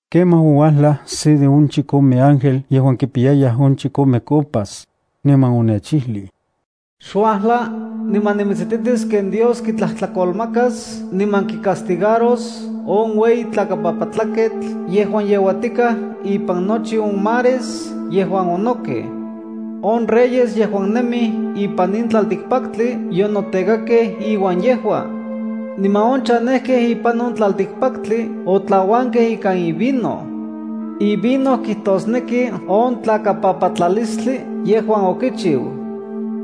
Kemaj ouajlaj se de on chikome ángel yejuan kipiyayaj on chikome copas, niman onechijlij: “Xuajla, niman nimitsititis ken Dios kitlajtlakolmakas niman kicastigaros on ueyi tlakapapatlaketl yejuan yeuatikaj ipan nochi on mares yejuan onojkej. On reyes yejuan nemij ipan in tlaltikpaktli yonotekakej iuan yejua. Niman on chanejkej ipan on tlaltikpaktli otlauankej ikan ivino. Ivino kijtosneki on tlakapapatlalistli yejuan okichiu.”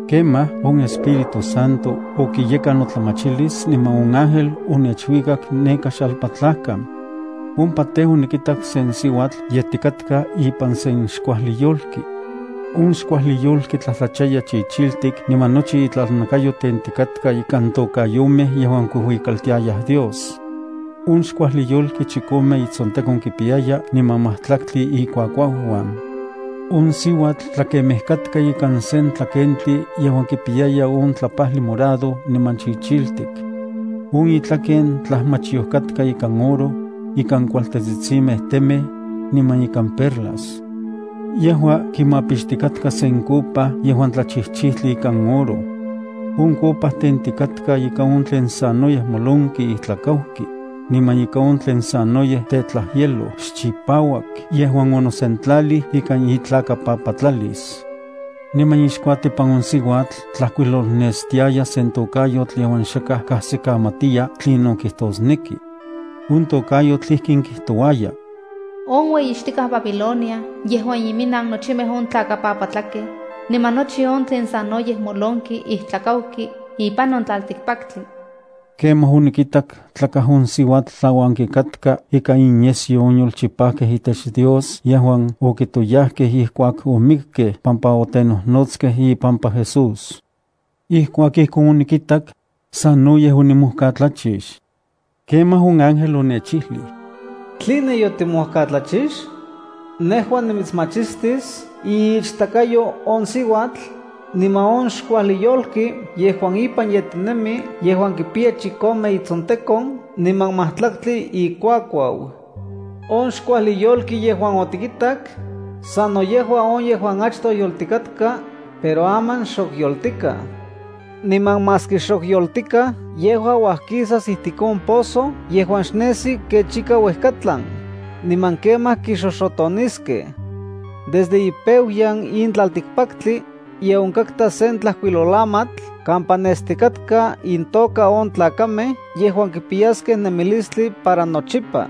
Kemaj, on Espíritu Santo okiyekan notlamachilis niman on ángel onechuikak neka xalpatlajkan. Ompa tej, onikitak sen siuatl yetikatka ipan sen xkuajli yolki. On xkuajli yolki tlajtlachaya chichiltik niman nochi itlakayo tentikatka ikan tokayomej yejuan kuijuikaltiayaj Dios. On xkuajli yolki chikome itsontekon kipiyaya niman majtlaktli ikuakuauuan. On siuatl tlakemej katka ikan sen tlakentli yejuan kipiyaya on tlapajli morado niman chichiltik. On itlaken tlajmachyoj katka ikan oro, ikan kualtetsitsimej temej, niman ikan perlas. Yejua kimapixtikatka sen copa yejuan tlachijchijtli ikan oro. On copa tentikatka ikan on tlen sanoyej molonki ijtlakauki, niman ika on tlen sanoyej tetlajyeloj xchipauak yejuan onosentlalij ika itlakapapatlalis. Niman ixkuatipan on siuatl tlajkuilolnestiaya sen tokayotl yejuan xakaj kajsikamatiya tlinon kijtosneki. On tokayotl ijkin kijtouaya: “On ueyixtikaj Babilonia yejua iminnanaj nochimej on tlakapapatlakej, niman nochi on tlen sanoyej molonki ijtlakauki ipan on tlaltikpaktli.” Kemaj onikitak tlakaj on siuatl tlauanki katka ika inyesyo on yolchipajkej itech Dios yejuan okitoyajkej ijkuak omikkej pampa otenojnotskej ipampa Jesús. Ijkuak ijkon onikitak, sanoyej onimojkatlachix. Kemaj on ángel onechijlij: “¿Tline yotimojkatlachix? Nejua nimitsmachistis iichtakayo on siuatl, niman on xkuajli yolki yejuan ipan yetinemi yejuan kipiya chikome itsontekon niman majtlaktli ikuakuau. On xkuajli yolki yejuan otikitak, sano yejua on yejuan achtoj yoltikatka, pero aman xok yoltikaj. Niman maski xok yoltikaj yejua kuajkisas ijtik on pozo yejuan xnesi kech ika uejkatlan, niman kemaj kixoxotoniskej. Desde ipeuyan in tlaltikpaktli, ye onkatka sen tlajkuilolamatl kampa nestikatka intoka on tlakamej yejuan kipiyaskej nemilistli para nochipa.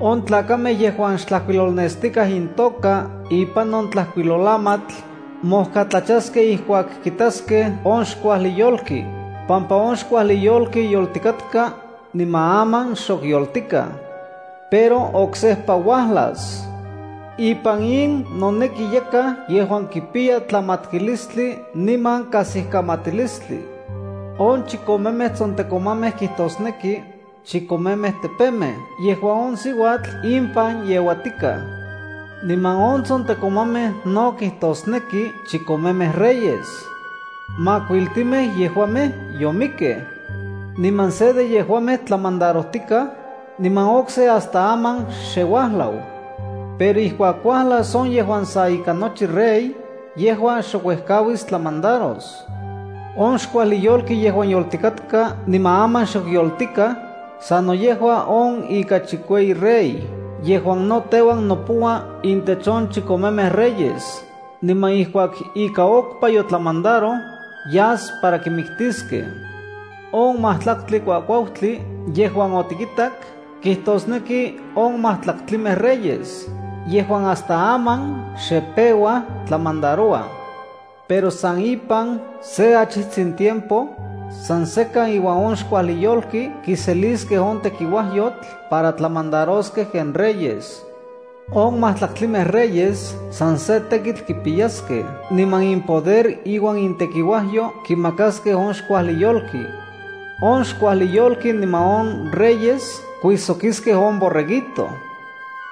On tlakamej yejuan xtlajkuilolnestikaj intoka ipan on tlajkuilolamatl, mojkatlachaskej ijkuak kitaskej on xkuajli yolki, pampa on xkuajli yolki yoltikatka, niman aman xok yoltikaj. Pero oksejpa uajlas. “Ipan in noneki yakaj yejuan kipiya tlamatkilistli niman kajsikamatilistli. On chikomemej tsontekomamej kijtosneki, chikomemej tepemej yejuan on siuatl impan yeuatikaj. Niman on tsontekomamej no kijtosneki chikomemej reyes. Makuiltimej yejuamej yomikkej. Niman se de yejuamej tlamandarojtikaj, niman okse hasta aman xye uajlau. Pero ijkuak uajlas on yejuan sa ika nochi rey, yejua xok uejkauis tlamandaros. On xkuajli yolki yejuan yoltikatka niman aman xok yoltikaj, sano yejua on ika chikueyi rey. Yejua no teuan nopoua intech on chikomemej reyes, niman ijkuak ika okpa yotlamandaroj, yas para kimiktiskej. “On majtlaktli kuakuautli yejuan otikitak kijtosneki on majtlaktlimej reyes yejuan hasta aman xe peuaj tlamandarouaj. Pero san ipan se achijtsin tiempo, san sekan iuan on xkuajli yolki kiseliskej on tekiuajyotl para tlamandaroskej ken reyes. On majtlaktlimej reyes san se tekitl kipiyaskej niman impoder iuan intekiuajyo kimakaskej on xkuajli yolki. On xkuajli yolki niman on reyes kuijsokiskej on Borreguito.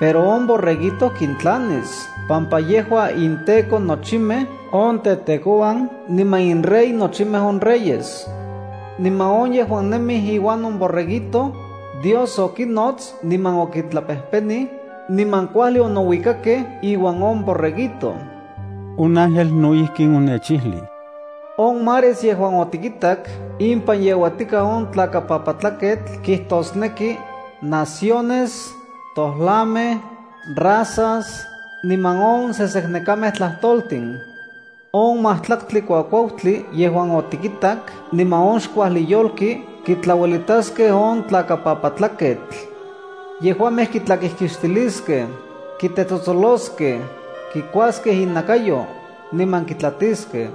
Pero on Borreguito kintlanis pampa yejua inTEKO nochimej on tetekouan niman inRey nochimej on reyes. Niman on yejuan nemij iuan on Borreguito, Dios okinnots niman okintlapejpenij, niman kuajli onouikakej iuan on Borreguito.” On ángel no ijkin onechijlij: “On mares yejuan otikitak impan yeuatikaj on tlakapapatlaketl kijtosneki: naciones, tojlamej, razas, niman on seseknekamej tlajtoltin. On majtlaktli kuakuautli yejuan otikitak niman on xkuajli yolki kitlauelitaskej on tlakapapatlaketl. Yejuamej kitlakijkixtiliskej, kitetsotsoloskej, kikuaskej inakayo, niman kitlatiskej.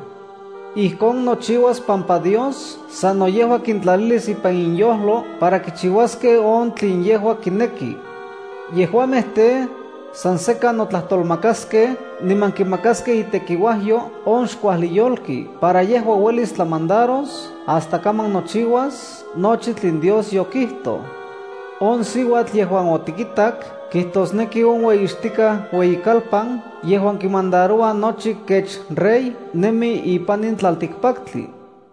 Ijkon nochiuas pampa Dios sano yejua kintlalilis ipan inyojlo para kichiuaskej on tlen yejua kineki. Yejuamej tej, san sekan notlajtolmakaskej niman kimakaskej itekiuajyo on xkuajli yolki para yejua uelis tlamandaros hasta kaman nochiuas nochi tlen Dios yokijtoj. On siuatl yejuan otikitak kijtosneki on ueyixtikaj ueyikalpan yejuan kimandaroua nochi kech rey nemi ipan in tlaltikpaktli.”